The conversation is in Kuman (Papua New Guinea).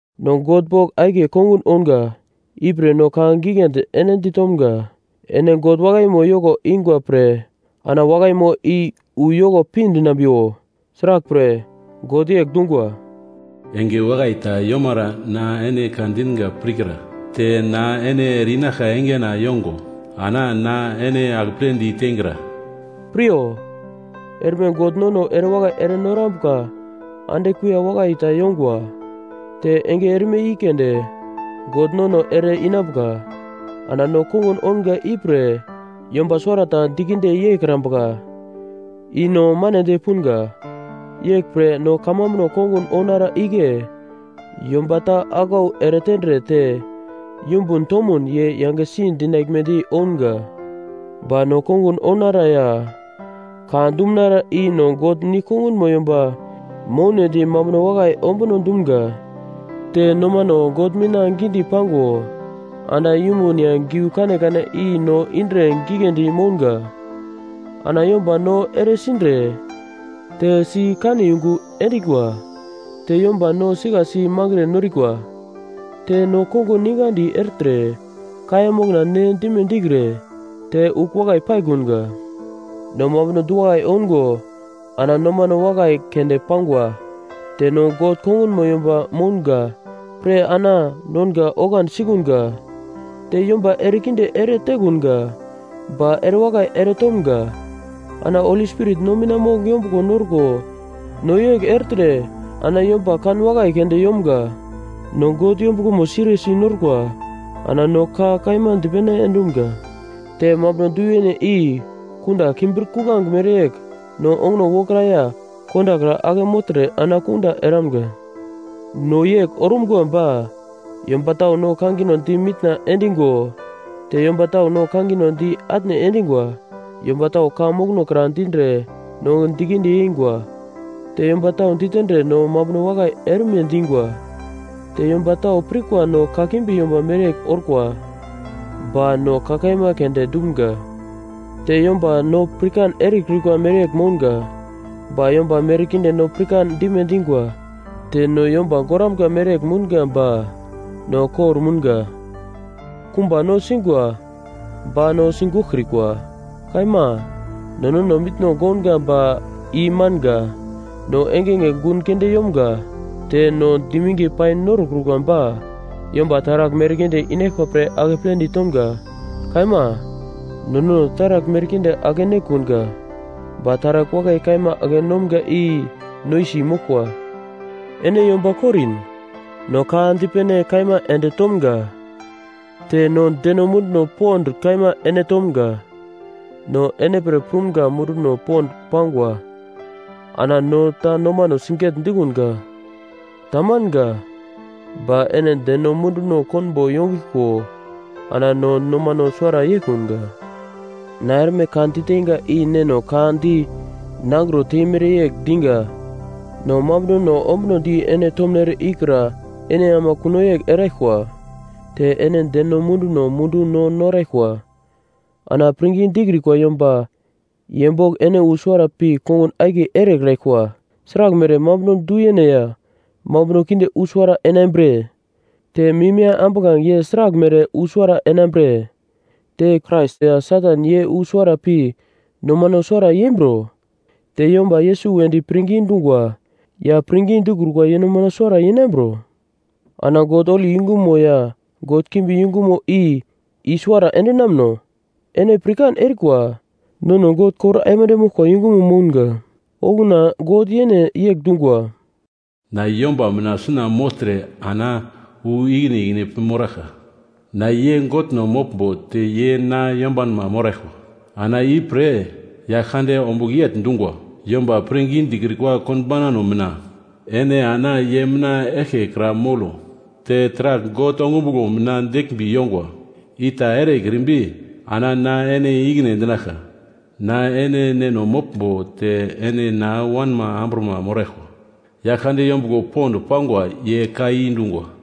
No God bogl akiye kongun ounga, ipre no ka giglendi ene ditomga, “Ene God wakaimo yoko ingwa pre ana wakaimo i wu yoko pindinambiwo.” Sraglpre, God yegl dungwa, “Enge wakai ta yomara na ene ka dinga pirkra, te na ene ere-inaglka engena yongo, ana na ene akepledi teingra.” Piryo! Erme God nono erewakai ere norambuka ande kuiya wakai ta yongwa. Te enge erme i keunde God nono ere-inambuka! Ana no kongun ounga ipre yomba suwarata dikinde yeikrambuka, i no manedi punga. Yeglpre no kamambuno kongun ounara igle yomba ta aglau eretendre te yumbun tomun ye yangesi dinaglmedi ounga. Ba no kongun ounara ya ka dumunara i no God nigl kongunmo yomba mounedi mambuno wakai ombuno dumga, te nomano God mina gidi pango ana yumbun ya giu kanekane i no indre giglendi mounga. Ana yomba no eresindre, te si kane yungu endingwa, te yomba no sikasi mangre norikwa. Te no kongun ningadi ertre, kaiya mokna ne dime dikre, te ugl wakai paikunga. No mambuno du-wakai oungo ana nomano wakai keunde pangwa. Te no God kongunmo yomba mounga pre ana nonga oglandi sikunga, te yomba erekinde ere tekunga ba erewakai eretomga. Ana Holi Spirit no mina mogl yombuglomo norko no yegl ertre ana yomba kanwakai keunde yomga. No God yombuglomo siriyesi norkwa ana no ka kaima di dipene endumga. Te mambuno du-yene i kunda kimbir-kuglange mereyegl no onguno wokra ya kondakra ake mogltre ana kunda eramga. No yegl orumga ba yomba tau no kangino di mitna endingo te yomba tau no kangino di atne endingwa. Yomba tau ka mokono kra dindre no dikinde yengwa, te yomba tau ditendre no mambuno wakai erime dingwa. Te yomba tau pirkwa no kakimbi yomba mereyegl orkwa, ba no ka kaima keunde dumga. Te yomba no pirkan erekrikwa mereyegl mounga, ba yomba merkinde no pirkan dime dingwa, te no yomba goramga mereyegl mounga ba no kor-mounga. Kumba no singwa, ba no sigoglkrikwa. Kaima, no nono mitno gounga ba i manga, no engenge gun keunde yomga, te no diminge pai norokrukwa ba yomba taragl merkinde inaglkwa pre akepledi tomga. Kaima, no nono taragl merkinde ake-nekunga ba taragl wakai kaima ake-nomga i noisi moglkwa. Ene yomba Korin. No ka dipene kaima ende tomga. Te no deno munduno pond kaima ene tomga. No ene pre prumga munduno pond pangwa ana no ta nomano sigegl dikunga. Tamanga. Ba ene deno munduno konbo yongiglko ana nono nomano suwara yeikunga. Na erme ka diteinga i neno ka di nangro temere yegl dinga. No mambunono ombunodi ene tomnere ikra ene ama kuno yegl eraglkwa. Te ene deno munduno mundu no noraglkwa. Ana pirngi dikrikwa yomba ye bogl ene wu suwara pi kongun akiye erekraglkwa. Sraglmere mambuno du-yene ya mambuno kinde wu suwara enambre? Te mim ya ambuglange ye sraglmere wu suwara enambre? Te Krais ya Satan ye wu suwara pi nomano suwara yembro? Te yomba Yesus wedi pirngi dungwa ya pirngi dikrukwa ye nomano suwara yeinambro? Ana God holi yungumo ya god kimbi yungumo i i-suwara endinamno? Ene pirkan erikwa, nono God kor aimande moglkwa yungumo mounga. Okuna God yene yegl dungwa, “Na yomba mina suna mogltre ana wu ikine ikine pi moraglka, na ye Godno moglmbo te ye na yombanma moraglkwa.” Ana ipre Yaglkande ombugl yegl dungwa, “Yomba pirngi dikrikwa konbaunano mina ene ana ye mina eglke kra molo. Te taragl God ongumuglo mina deglmbi yongwa i ta erekrimbi, ana na ene i-ikine endinaglka.” “Na ene neno moglmbo te ene na wanma amburama moraglkwa, Yaglkande yombuglo pond pangwa ye ka i dungwa.”